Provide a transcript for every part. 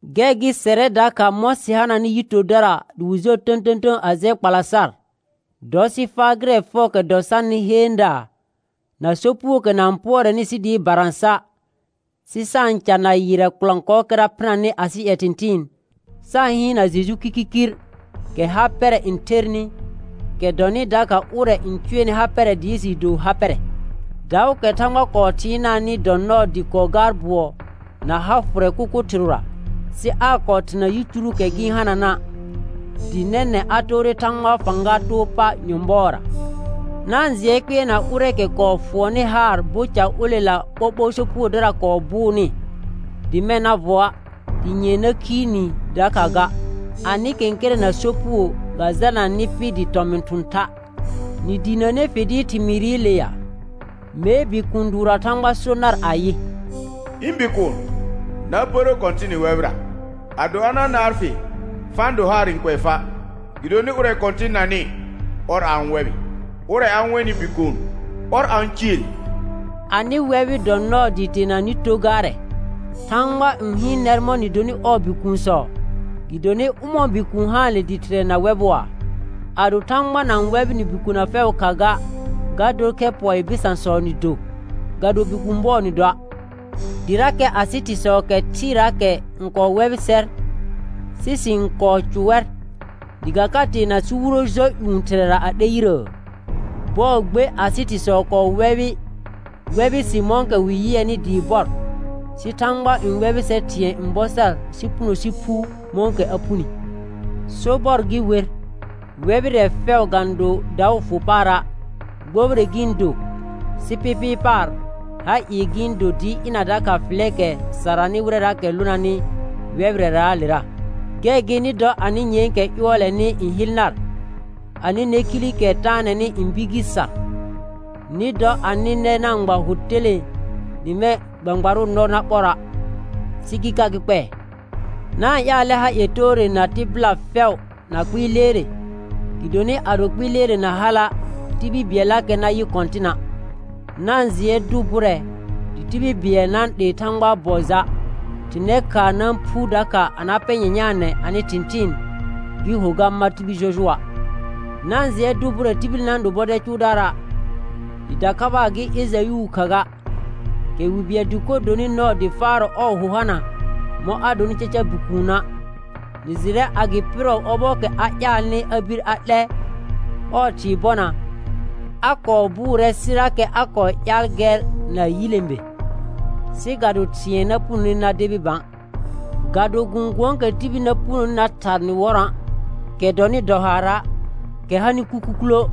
Gɛr gɩ sɛrɛ dakha mɔ̃ sɩ hananɩ yi tordara dɩ wɩ jɔr tə̃tə̃tə̃ a jɛ kpala sar, dɔ sɩ faa gɩrɛ fɛʋʋkɛ dɔ sarnɩ heendaa na sopugookɛ na-n pʋɔrɛnɩ sɩ dɩɩ barã sa', sɩ sa-n ca na yɩrrɛ kɔlɔ̃kɔɔkɛra phɩnanɩ asɩ ƴɛ thɩ̃thɩɩn, sa-n hɩɩnna Jeju kirkirkir, kɛ ha pɛrɛ n thernɩ, kɛ dɔnɩ dakha ʋrɛ n cʋɛnɩ ha pɛrɛ dɩɩ jɩɩ do ha pɛrɛ. Daʋʋkɛ Thãgba kɔɔ thɩɩnaanɩ dɔ nɔɔ dɩ kɔɔ gaar bʋɔ na ha fʋrɛ kʋkʋ thɩrʋra, sɩ aa kɔɔ therna yicuruukɛ gɩ-n hanana', dɩ nɛnɛ̃ a toore Thãgbaa fãga too pa nyɔ̃bɔɔra. Na-n jɩɛ kpɩɛrna ʋrɛɛkɛ kɔɔ fʋɔnnɩ haar bo ca olela ɓoɓo sopugodara kɔɔ bʋʋnɩ, dɩ mɛ̃ na vɔa', dɩ nyɛ̃ɛ na khiir ni dakha ga. Anɩ kɛ̃kɛrɛ̃ na sopugo ga jalna nɩ pɩ dɩ tɔmɩn thʋ̃ tha'. Nɩ diinəne fɩl dɩɩr thɩmɩɩrɩle ya? Mee bikũu dʋʋrra Thãgba so nar ayɩ: «Ɩ̃ bikuun, na pərə Kɔ̃tɩnɩ wɛbɩra; ado a na naar fɩ, fa-n do haar n kʋɛ fa'. Gɩdonɩ ʋrɛ Kɔ̃tɩn nanɩ, ɔr a-n wɛbɩ, ʋrɛ a-n wenɩ bikuun ɔr a-n ciil.» Anɩ wɛbɩ dɔ nɔɔ dɩɩ teena nɩ to gaarɛ. Thãgba n hɩɩn nɛr mɔ̃ nɩ donɩ ɔɔ bikuunsɔ; gɩdonɩ ʋmɔ̃ɔ bikuun haanle dɩ thɩrɛ na wɛbʋa? Ado Thãgba na-n wɛbɩ nɩ bikona fɛʋʋ kha ga, ga dor khɛ pɔɩɩ bɩsãsɔ nɩ do, ga do bikũu bɔ nɩ doa'. Dɩrakɛ asɩ thɩsɔ kɛ thɩɩraakɛ n kɔɔ wɛbɩ sɛr, sɩ sɩ-n kɔɔ cʋ wɛr, dɩ ga ka teena sɩ wuro jɔ ƴũ Thɩrɛra a 'lɛ yirəə? Bɔɔ gbe asɩ thɩsɔ kɔɔ wɛbɩ sɩ mɔ̃kɛ wɩ yɩɛnɩ dɩɩ bɔr, sɩ Thãgba n wɛbɩ sɛr thɩ̃ɛ n bɔ sar sɩ puno sɩ phu mɔ̃kɛ a phuni. Sobɔr gɩ wer, wɛbɩrɛ fɛʋ ga-n do daʋ fʋ paara', gbobire gɩ-n do, sɩ pɩpɩɩ paar ha ɩɩ gɩ-n do dɩɩ ɩna dakha fɩlɛɛkɛ saranɩ wɩrɛraakɛ lonanɩ wɛbɩrɛraalera. Gɛr gɩ nɩ dɔ anɩ nyɛ̃ɛkɛ ƴʋɔlɛnɩ n hɩl nar, anɩ nɛkhilikɛ taanɛnɩ n bir gɩ sar. Nɩ dɔ anɩ nɛ na-n gba hʋ telẽe dɩ mɛ̃ gbãgbarʋʋ nɔ na ɓɔra', sɩ gɩ ka gɩ kpɛɛ. Na-n ƴaalɛ ha ie toore na tɩbɩla fɛʋ na kpɩɩ leere, gɩdonɩ ado kpɩɩ leere na hala', tibil bɩɛllakɛ na yɩ Kɔ̃tɩna'. Na-n jɩɛ dʋ bʋrɛ dɩ tibil bɩɛl na-n 'lee Thãgbaa bɔ ja', thɩr nɛ khaa na-n phu dakha a na pɛ nyanyaanɛ anɩ thɩ̃thɩɩn gɩ ho ga mar tibil jɔjʋɔa'. Na-n jɩɛ dʋ bʋrɛ tibil na-n do bɔdɛl cʋʋdaara', dɩ dakhabaa gɩ Ejayʋʋ kha ga, kɛ wi bɩɛl dɩkor donɩ nɔɔ dɩ faarɔ ɔɔ hʋ hana mɔ̃ a donɩ caca bikuuna'. Nɩ jɩrɛ a gɩ pɩrɔ ɔbɔɔkɛ a ƴaalnɩ a bir a 'lɛ ɔɔ thɩɩ bɔna, a kɔɔ bʋʋrɛ sɩrakɛ a kɔɔ ƴaal gɛr na yilẽbe, sɩ ga do thɩ̃ɛ na punone na debi bã. Ga do gɔ̃gʋ̃ɔɔkɛ tibil na punoni na thar nɩ wɔrɔ̃a', kɛ dɔnɩ dɔ haara', kɛ hanɩ kukukulə',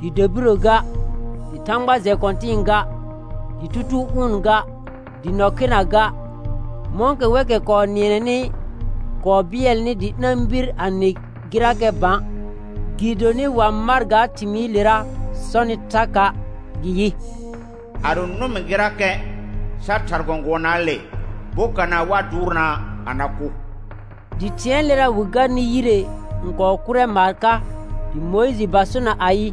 dɩ dabirə ga, dɩ thãgba jɛ kɔ̃tɩ̃ɩ ga, dɩ tutuu ʋʋn ga, dɩ nɔ khena ga, mɔ̃kɛ wɛkɛ kɔɔ nɩɛnɛnɩ kɔɔ bɩɛlnɩ dɩ ɩna-n bir a nɩ gɩrakɛ bã; gɩdonɩ wa mar ga thɩmɩɩlera sɔnɩ thaka', gɩ yɩ: «Ado nʋm gɩrakɛ sa thar gɔ̃gʋɔnaale bokana wa dʋʋrnaa a na kʋ.» Dɩ thɩ̃ɛɛlera wɩ garnɩ yire n kɔɔ kʋrɛ maar ka, dɩ Mʋɩjɩ ba sona ayɩ,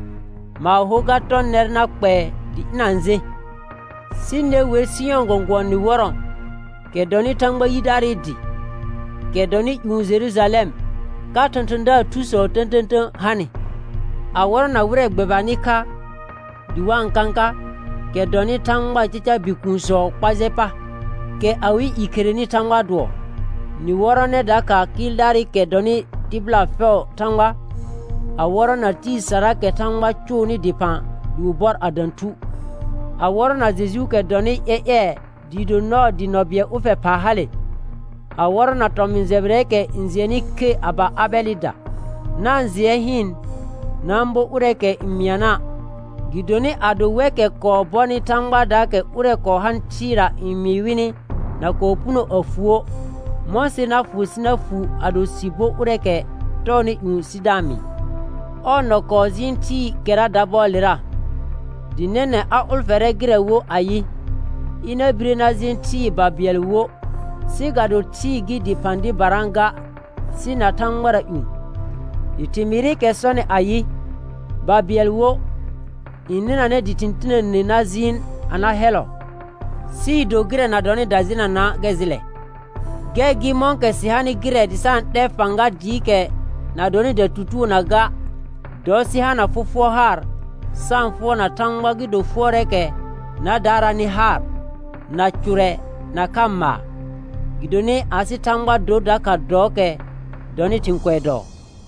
maar hor ga tɔ nɛr na kpɛɛ dɩ ɩna-n jẽ. Sɩ ne wer Sɩyɔ̃ gɔ̃gʋ̃ɔ nɩ wɔrɔ̃, kɛ dɔnɩ Thãgba yidaarɩ dɩ, kɛ dɔnɩ ƴũ Jerujalɛm, ka thɔ̃thɔ̃daar thusɔ tə̃tə̃tə̃ hanɩ, a wɔrɔna wɩrɛ gbɛbanɩ kha dɩ wa-n kãka, kɛ dɔnɩ Thãgbaa caca bikuunsɔɔ kpa jɛ pa, kɛ awɩ i kherenɩ Thãgbaa dʋɔ; nɩ wɔrɔnɛ dakha kɩɩldaarɩkɛ dɔnɩ tɩbɩla fɛʋʋ Thãgba, a wɔrɔna tɩɩ saraakɛ Thãgba cʋʋnɩ dɩphã dɩ wɩ bɔr a dã thu, a wɔrɔna Jejuukɛ dɔnɩ ƴɛƴɛɛ dɩɩ do nɔɔ dɩ nɔ bɩɛl ʋlfɛ phaa hale, a wɔrɔna tɔmɩ̃ jɛbɩrɛɛkɛ n jɩɛnnɩ khe a ba Abɛlɩda. Na-n jɩɛ hɩɩn, na-n bo ʋrɛɛkɛ n mɩana', gɩdonɩ ado wɛkɛ kɔɔ bɔnɩ Thãgbaadaakɛ ʋrɛ kɔɔ hanɩ thɩɩra n mɩɩ wɩnɩ na kɔɔ puno a fuə', mɔ̃ ser na fʋ sɩ na fuu ado sɩ bo ʋrɛɛkɛ tɔɔnɩ ƴũ sɩ da-n mɩɩ. Ɔɔ nɔ kɔɔ jɩɩn thɩɩkɛra dabɔɔlera; dɩ nɛnɛ̃ a ʋlfɛrɛ gɩrɛ wo ayɩ, ɩna bire na jẽ thɩɩ babɩɛl wo, sɩ ga do thɩɩ gɩ dɩphã dɩbara ga sɩ na thãgbara ƴũ. Dɩ thɩmɩɩrɩkɛ sɔnɩ ayɩ: «Babɩɛl wo» n nɩnanɛ dɩ thɩ̃ tinəne na jɩɩn a na hɛllɔ, sɩɩ do gɩrɛ na dɔnɩ dajenana' gɛr jɩlɛ. Gɛr gɩ mɔ̃kɛ sɩ hanɩ gɩrɛ dɩ sa-n 'lɛ fãga dɩɩkɛ na dɔnɩ datutugonaa ga, dɔ sɩ hana fɔfʋɔr haar sa-n fʋɔrna Thãgba gɩ do fʋɔrɛɛkɛ na daaraanɩ haar, na cʋrɛ nakha maar. Gɩdonɩ asɩ Thãgba dor dakha dɔɔkɛ dɔnɩ thɩ̃ kʋɛ dɔɔ.